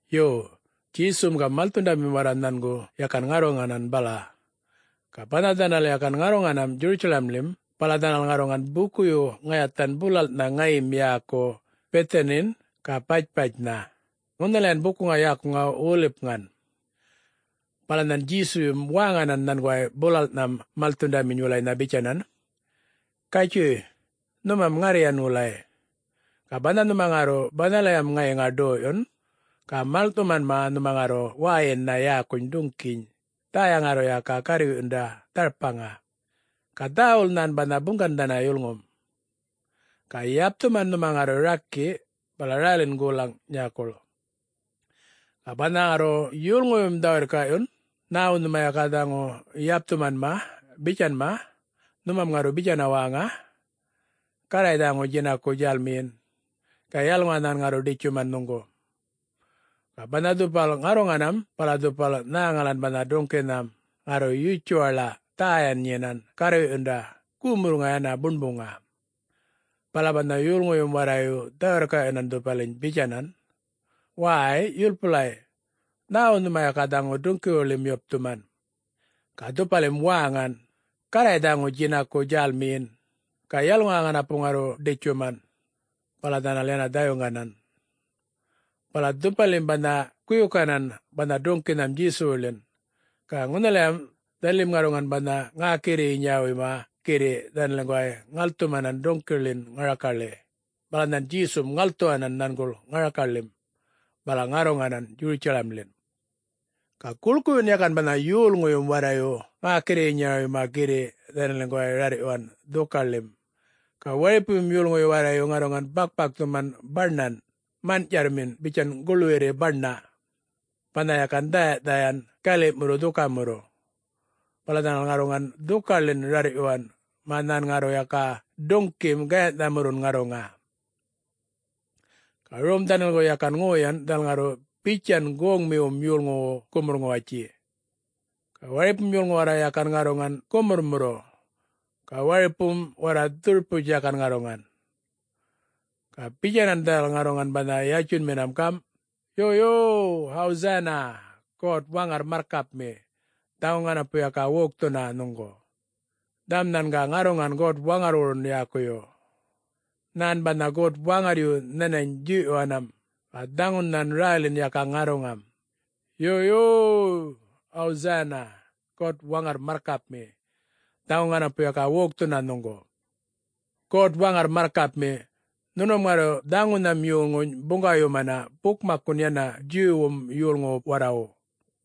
Yo, Djesum ga malthundamim warra nhangu yakan ŋarruŋanan bala. Ga banha dhanal yakan ŋarruŋanam Djurutjalamḻim, bala dhanal ŋarruŋan bukuyu ŋayathan bulalꞌnha ŋayim yäku Bithanin ga Batpatjnha, ŋunhalayan bukuŋa yäkuŋa Wolipŋan. Bala nhan Djesuyum wäŋanan nhanguway bulalꞌnham malthundaminy wulaynha bitjanan, “Gatjuy nhumam ŋarryan wulay. Ga banha nhuma ŋarru banhalayam ŋayiŋa ḏoyꞌyun, ga maḻŋꞌthumanma nhuma ŋarru wäyinnha yäkuny duŋꞌkiny, dhäya ŋarru yaka garrwiꞌyunda dharpaŋa. Ga dhäwul nhan banha buŋgannharra yulŋum. Ga yapthuman nhuma ŋarru rakiꞌ, bala rälin golaŋ nyäkuḻ. Ga banha ŋarru yolŋuyum dhä-wirrkaꞌyun, ‘Nhäwu nhuma yaka dhaŋu yapthumanma?’ bitjanma, nhumam ŋarru bitjana wäŋa, ‘Garray dhaŋu djinaku djälmiyin, ga yalŋuwa nhan ŋarru ḏitjuman nhuŋgu.’” Ga banha dhupal ŋarruŋanam bala dhupal nhäŋalan banha duŋꞌkinham, ŋarru yutjuwaḻa, dhäyan nyinan garrwiꞌyunda gumurrŋa yana buṉbuŋa. Bala banha yolŋuyum warrayu dhä-wirrkaꞌyuwanan dhupaliny bitjanan, “Wäy! Yulpulay, nhäwu nhuma yaka dhaŋu duŋꞌkiwuḻim yapthuman?” Ga dhupalim wäŋan, “Garray dhaŋu djinaku djälmiyin, ga yalŋuwa ŋanapu ŋarru ḏitjuman.” Bala dhanal yana dhayuŋganan. Bala dhupalim banha guyukanan banha duŋꞌkinham Djesuwuḻin. Ga ŋunhalam dhanalim ŋarruŋan banha ŋäkirrinyawuyma girriꞌ dhanaliŋguway ŋalthumanan duŋꞌkiwuḻin ŋarakaḻi, bala nhan Djesum ŋalthuwanan nhanguḻ ŋarakaḻim, bala ŋarruŋanan Djurutjalamḻin. Ga guḻkuyun yakan banha yolŋuyum warrayu ŋäkirrinyawuyma girriꞌ dhanaliŋguway rarrꞌyuwan dhukaḻim. Ga waripuyum yolŋuyu warrayu ŋarruŋan bakꞌpakthuman baṉan manꞌtjarrmin bitjan guḻwirri baṉa, banha yakan dhäyaꞌdhayan galiꞌmurru dhukamurru. Bala dhanal ŋarruŋan dhukaḻin rarrꞌyuwan mä nhan ŋarru yaka duŋꞌkim gayanhꞌthamurrun ŋarruŋa. Ga rom dhanaliŋgu yakan ŋoyan dhanal ŋarru bitjan goŋmiwum yolŋuwu gumurr-ŋuwatji. Ga waripum yolŋu warra yakan ŋarruŋan gumurrmurru, ga waripum warra dhurputj yakan ŋarruŋan. Ga bitjanan dhanal ŋarruŋan banha yatjunminam gamꞌ, “Yo yo-yo, Hosanna! God-Waŋarr marrkapmi, dhaŋu ŋanapu yaka wokthuna nhuŋgu! Dhaŋum nhan ga ŋarruŋam God-Waŋarrwurun yäkuyum. Nhän banha God-Waŋarryu nhanany djuyꞌyuwanam, ga dhaŋun nhan rälin yaka ŋarruŋam. Yo, yo-yo! Hosanna! God-Waŋarr marrkapmi, dhaŋu ŋanapu yaka wokthuna nhuŋgu! God-Waŋarr marrkapmi, nhunum ŋarru dhaŋunham yolŋuny buŋgawayumana bukmakkun yana Djuwwum yolŋuwu warrawu,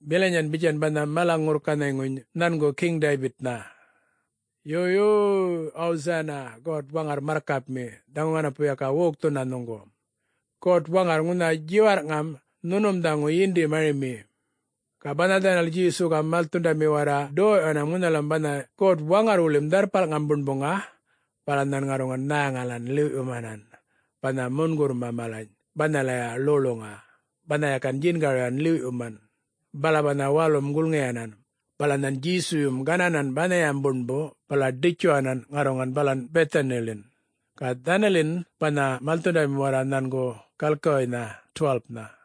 bilanyan bitjan banha mala-ŋurrkanhayŋuny nhangu Geŋ Daybitnha. Yo, yo-yo! Hosanna! God-Waŋarr marrkapmi, dhaŋu ŋanapu yaka wokthuna nhuŋgu! God-Waŋarr, ŋunha djiwarrꞌŋam nhunum dhaŋu yindi-marimi!” Ga banha dhanal Djesu ga malthundami warra ḏoyꞌyuwanam ŋunhalam banha God-Waŋarrwuḻim Dharrpalŋam Buṉbuŋa, bala nhan ŋarruŋan nhäŋalan ḻiwꞌyumanan, banha mungurrma malany banhalaya ḻoḻuŋa, banha yakan djingaryuwan ḻiwꞌyuman. Bala banha walum giḻyuwanan, bala nhan Djesuyum gananan banhayam buṉbu bala ḏitjuwanan ŋarruŋan balan Bithaniḻin, ga dhanalin banha malthundamin warra nhangu galkiwuynha 12-nha.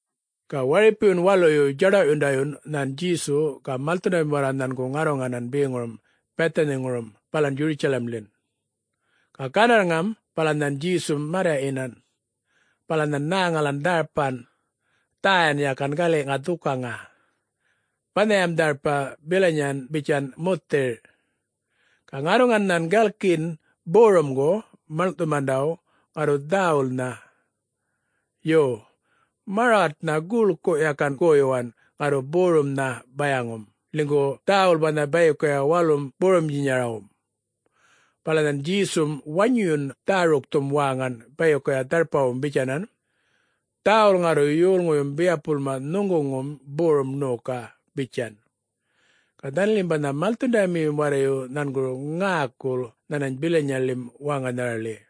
Ga waripuyun waluyu djaḏawꞌyundayun nhan Djesu ga malthundamim warra nhangu ŋarruŋanan beŋurum Bithaniŋurum balan Djurutjalamḻin. Ga gandarrŋam bala nhan Djesum marryaꞌyinan. Bala nhan nhäŋalan dharpan, dhäyan yakan galiꞌŋa dhukaŋa. Banhayam dharpa bilanyan bitjan muthirꞌ. Ga ŋarruŋan nhan galkiyin borumgu maḻŋꞌthumandawu ŋarru dhäwulnha. Yo, marwaṯma guḻku yakan goyuwan ŋarru borumnha bayaŋum, ḻinygu dhäwul banha bayikuya walum borumdjinyarawum. Bala nhan Djesum wanyuyun dhärukthum wäŋan bayikuya dharpawum bitjanan, “Dhäwul ŋarru yolŋuyum biyapulma nhuŋguŋum borum ṉoka!” bitjan. Ga dhanalim banha malthundamiyum warrayu nhanguru ŋäkul nhanany bilanyaḻim wäŋanharaḻi.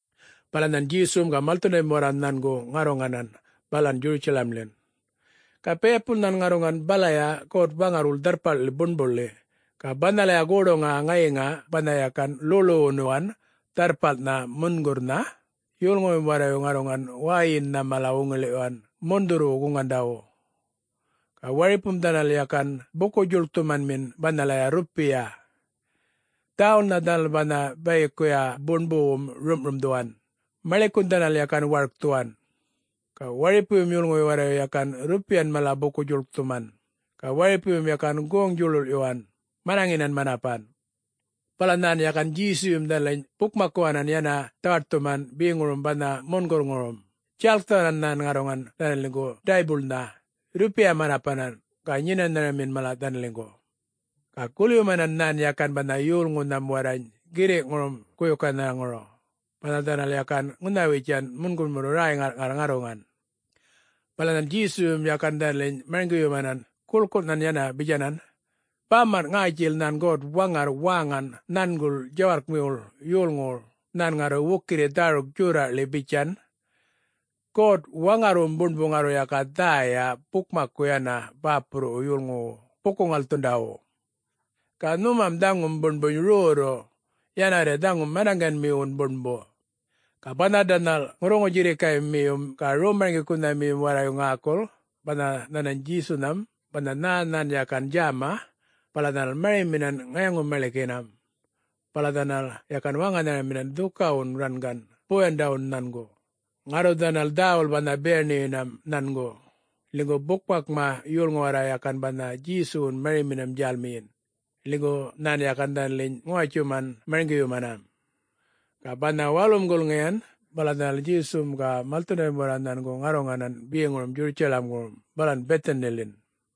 Bala nhan Djesum ga malthundamim warra nhangu ŋarruŋanan balan Djurutjalamḻin. Ga biyapul nhan ŋarruŋan balaya God-Waŋarrwuḻ Dharrpalḻi Buṉbuḻi. Ga banhalaya goḏuŋa ŋayiŋa banha yakan ḻoḻuwunuwan Dharrpalnhan Mungurrnha, yolŋuyum warrayu ŋarruŋan wäyinnha mala wuŋiḻiꞌyuwan mundhurrwu-guŋandawu. Ga waripum dhanal yakan buku-djuḻkthumanmin banhalaya rrupiya. Dhäwulnha dhanal banha bayikuya buṉbuwum rumꞌrumdhuwan, maḻikun dhanal yakan warkthuwan. Ga waripuyum yolŋuyu warrayu yakan rrupiyan malany buku-djuḻkthuman, ga waripuyum yakan goŋ-djuḻuḻꞌyuwanan, manaŋinan manapan. Bala nhan yakan Djesuyum dhanaliny bukmakkuwanan yana dhawaṯthuman beŋurum banha mungurrŋurum, djalkthuwanan nhan ŋarruŋan dhanaliŋgu daybuḻma, rrupiya manapanan ga nyenanhamin mala dhanaliŋgu. Ga gulyumanan nhan yakan banha yolŋunham warrany girriꞌŋurum guyukanharaŋuru, banha dhanal yakan ŋunhawitjan mungurrmurru räy-ŋarrꞌŋarr ŋarruŋan. Bala nhan Djesuyum yakan dhanaliny marŋgiyumanan guḻkunhan yana bitjanan, “Bamanꞌ ŋätjil nhan God-Waŋarr wäŋan nhanguḻ djawarrkmiwuḻ yolŋuwuḻ nhan ŋarru wukirri dhäruk djorraꞌḻi bitjan, ‘God-Waŋarrwum Buṉbu ŋarru yaka dhäya bukmakku yana bäpurruwu yolŋuwu buku-ŋalthundawu.’ Ga nhumam dhaŋum Buṉbuny rrorru, yanawarri dhaŋu manaŋganmiwun buṉbu.” Ga banha dhanal ŋurruŋu-djirrikaymiyum ga rom-marŋgikunhamiyum warrayu ŋäkul, banha nhanany Djesunham banha nhä nhan yakan djäma, bala dhanal mariminan ŋayaŋu-maḻikinam. Bala dhanal yakan wäŋanharaminan dhukawun rangan boyandawun nhangu, ŋarru dhanal dhäwul banha biyaṉiyinam nhangu ḻinygu bukmakma yolŋu warra yakan banha Djesuwun mariminam djälmiyin, ḻinygu nhan yakan dhanaliny ŋuwatjuman marŋgiyumanan. Ga banha walum gulŋiyan bala dhanal Djesum ga malthundamim warra nhangu ŋarruŋanan beŋurum Djurutjalamŋurum balan Bithaniḻin.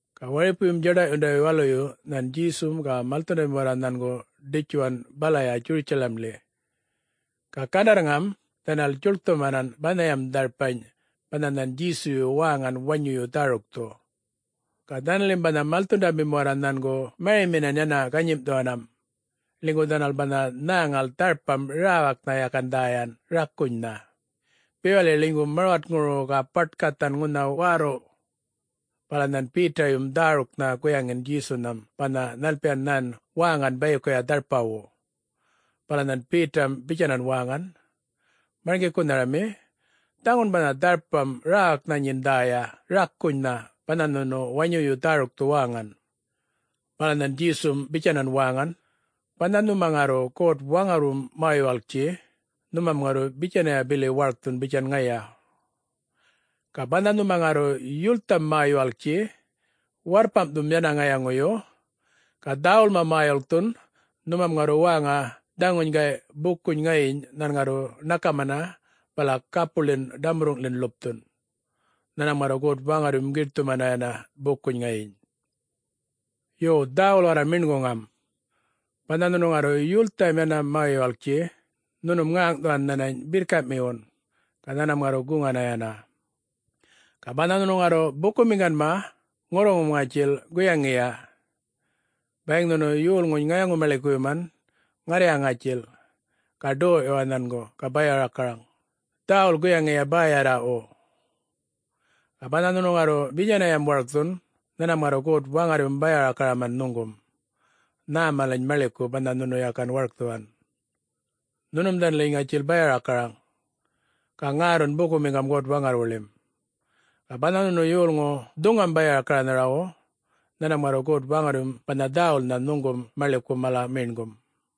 Ga waripuyun djaḏawꞌyundayu waluyu nhan Djesum ga malthundami warra nhangu ḏitjuwan balaya Djurutjalamḻi. Ga gandarrŋam dhanal djuḻkthumanan banhayam dharpany banha nhan Djesuyu wäŋan wanyuyu dhärukthu. Ga dhanalim banha malthundamim warra nhangu mariminan yana ganyimꞌthuwanam, ḻinygu dhanal banha nhäŋal dharpam räwaknha yakan dhäyan, rakunynha, bewaḻi ḻinygu marwatŋuru ga baṯ-gathan ŋunha wärrurrꞌ. Bala nhan Betayum dhäruknha guyaŋin Djesunhan banha nhalpiyan nhan wäŋan bayikuya dharpawu. Bala nhan Betam bitjanan wäŋan, “Marŋgikunharami, dhaŋun banha dharpam räwaknha nyin dhäya rakunynha, banha nhunu wanyuyu dhärukthu wäŋan!” Bala nhan Djesum bitjanan wäŋan, “Banha nhuma ŋarru God-Waŋarrwum mä-yuwalktji, nhunum ŋarru bitjanya bili warkthun bitjan ŋaya. Ga banha nhuma ŋarru yultham mä-yuwalktji warrpamꞌthum yana ŋayaŋuyu, ga dhäwulma mä-yuḻkthun, nhumam ŋarru wäŋan dhaŋuny gayꞌ bukuny ŋayiny nhan ŋarru ṉakamana bala gapuḻin ḏamurruŋꞌḻin ḻupthun. Nhanmam ŋarru God-Waŋarryum giṯthumana yana bukuny ŋayiny. Yo, dhäwul warra meṉguŋam. Banha nhunu ŋarru yultham yana mä-yuwalktji, nhunum ŋäŋꞌthuwan nhänany birrkaꞌmiwun, ga nhanmam ŋarru guŋana yana. Ga banha nhunu ŋarru bukumiŋganma, ŋurruŋum ŋatjil guyaŋiya: Bayiŋ nhunu yolŋuny ŋayaŋu-maḻikuyuman, ŋarrya ŋätjil, ga doyꞌyuwa nhangu ga baya-rakaraŋ, dhäwul guyaŋiya bäyarraꞌwu. Ga banha nhunu ŋarru bitjanayam warkthun, nhanmam ŋarru God-Waŋarryum baya-rakaraman nhuŋgum, nhä malany maḻiku banha nhunu yakan warkthuwan. Nhunum dhanaliŋgu ŋatjil baya-rakaraŋ, ga ŋärrun bukumiŋga God-Waŋarrwuḻim. [Ga banha nhunu yolŋu dhuŋam baya-rakaranharawu, nhanmam ŋarru God-Waŋarryum banha dhäwulnha nhuŋgum maḻiku mala meṉgum.]”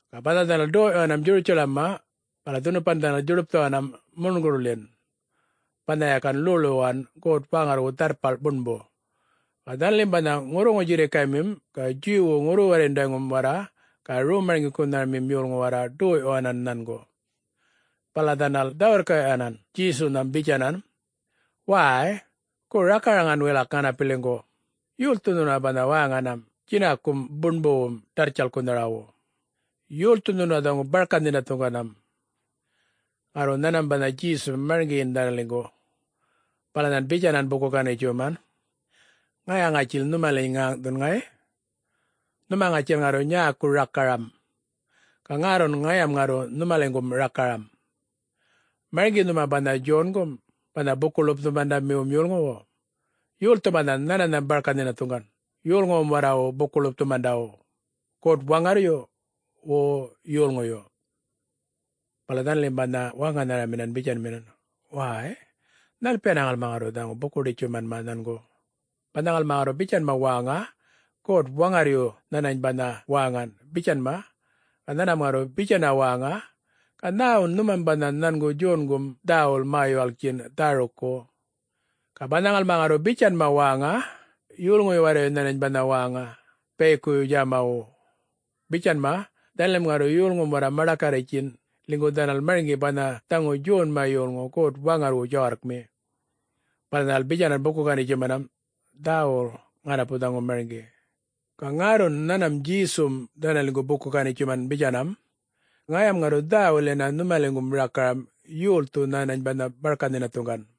Ga banha dhanal ḏoyꞌyuwan Djurutjaḻamma bala dhunupan dhanal djuḏupthuwanam mungurrḻin banha yakan ḻoḻuwunuwan God-Waŋarrwu Dharrpal Buṉbu. Ga dhanalim banha ŋurruŋu-djirrikaymim ga Djuwwu ŋurru-warryundayŋum warra ga rom-marŋgikunhamim yolŋu warra ḏoyꞌyuwanan nhangu. Bala dhanal dhä-wirrkaꞌyuwanan Djesunham bitjanan, “Wäy, gu rakaraŋan wilak ŋanapiliŋgu, yolthu nhuna banha wäŋanam djinakum buṉbuwum ḏarrtjalkkunharawu? Yolthu nhuna dhaŋu barka-nhinathuŋganam?” Ŋarru nhanmam banha Djesum marŋgiyin dhanaliŋgu. Bala nhan bitjanan buku-ganitjuman, “Ŋaya ŋatjil nhumaliny ŋäŋꞌthun, ŋayꞌ. Nhuma ŋatjil ŋarru nyäku rakaram, ga ŋärrun ŋayam ŋarru nhumaliŋgum rakaram. Marŋgi nhuma banha Djongum, banha Buku-ḻupthumandamiwum yolŋuwu? Yolthu banha nhananham barka-nhinathuŋgan yolŋuwum warrawu buku-ḻupthumandawu? God-Waŋarryu, wo yolŋuyu? Bala dhanalim banha wäŋanharamin bitjanminan, “Wäy, nhalpiyana ŋalmam ŋarru dhaŋu buku-ganitjuman nhangu? Banha ŋalma ŋarru bitjanma wäŋa, ‘God-Waŋarryu nhanany banha wäŋan,’ bitjanma. Ga nhanmam ŋarru bitjana wäŋa, ‘Ga nhäwun nhumam banha nhangum Djongum dhäwul mä-yuwalkin dhärukku?’ Ga banha ŋalma ŋarru bitjanma wäŋa, ‘Yolŋuyu warrayu nhanany banha wäŋa bayikuya djämawu,’ bitjanma, dhanalim ŋarru yolŋum warra maḏakarritjtjin, ḻinygu dhanal marŋgi banha dhaŋu Djonma yolŋu God-Waŋarrwu djawarrkmi.” Bala dhanal bitjanan buku-ganitjumanam, “Dhäwul ŋanapu dhaŋu marŋgi!” Ga ŋärrun nhanmam Djesum dhanaliŋgu buku-ganitjuman bitjanam, “Ŋayam ŋarru dhäwul yana nhumaliŋgum rakaram yolthu nhänany banha barka-nhinathuŋgan.”